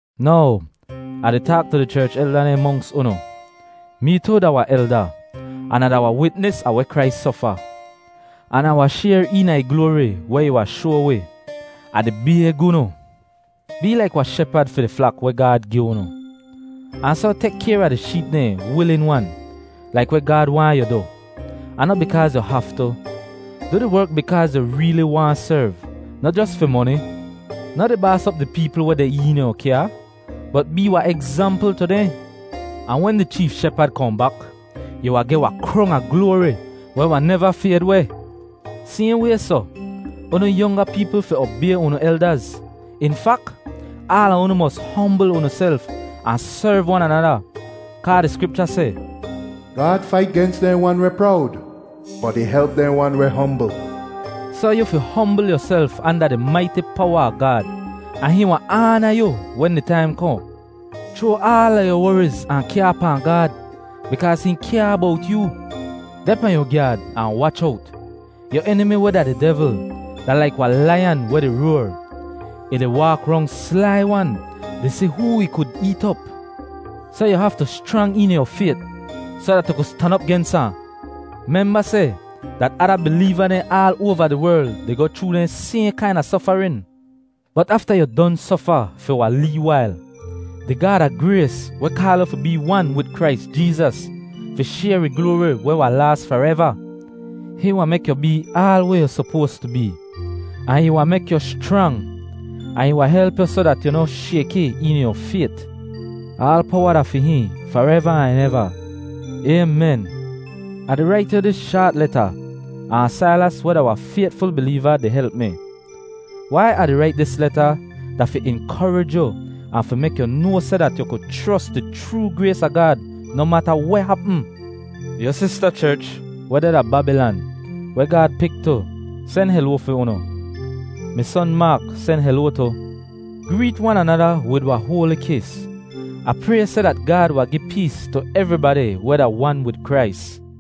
Now, Ah di taak tu di cherch elda dehn monks unu. Mee tu da wahn elda an Ah da wahn witnis a weh Krais sofa, an Ah wahn shayr eena ih gloari weh ih wahn shoa wi. Ah di bayg unu, bee laik wahn shepad fi di flak weh Gaad gi unu, ahn soh tek kayr a di sheep dehn wilin-wan laik weh Gaad waahn yu du, ahn noh bikaaz yu haftu. Du di werk bikaaz yu reeli waahn serv, noh jos fi moni. Noh di baas op di peepl weh deh eena yu kyaa, bot bee wahn egzampl tu dehn. Ahn wen di Cheef Shepad kohn bak, yu wahn geh wahn krong a gloari weh wahn neva fayd weh. Sayhn way soh, unu yonga peepl fi obay unu eldaz. In fak, aala unu mos hombl unuself ahn serv wan anada. Kaa di Skripcha seh, “Gaad fait gens dehn wan weh prowd, bot ih help dehn wan weh hombl.” Soh yu fi hombl yuself anda di maiti powa a Gaad, ahn hihn wahn aana yu wen di taim kohn. Chroa aala yu woriz ahn kyaa pahn Gaad, bikaaz hihn kyaa bowt yoo. Deh pahn yu gyaad, ahn wach owt! Yu enimi, weh da di devl, da laik wahn laiyan weh di roar; ih di waak rong slai-wan di si hoo ih kud eet op. Soh yu haftu schrang eena yu fayt soh dat yu ku stan op gens ahn. Memba seh dat ada bileeva dehn aal oava di werl di goh chroo dehn sayhn kaina sofarin. Bot afta yu don sofa fi wahn lee wail, di Gaad a grays weh kaal yu fi bee wan wid Krais Jeezas, fi shayr ih gloari weh wahn laas fareva, hihn wahn mek yu bee aal weh yu sopoas tu bee. Ahn ih wahn mek yu schrang, ahn ih wahn help yu soh dat yu noh shayki eena yu fayt. Aal powa da fi hihn fareva ahn eva. Aymen. Ah di rait yu dis shaat leta, ahn Sailas, weh da wahn faytful bileeva, di help mi. Wai Ah di rait dis leta da fi inkorij yu ahn fi mek yu noa seh dat yu ku chros di chroo grays a Gaad noh mata weh hapm. Yu sista cherch weh deh da Babilan, weh Gaad pik tu, sen heloa fi unu. Mi son, Maak, sen heloa tu. Greet wan anada wid wahn hoali kis. Ah pray seh dat Gaad wahn gi pees tu evribadi weh da wan wid Krais.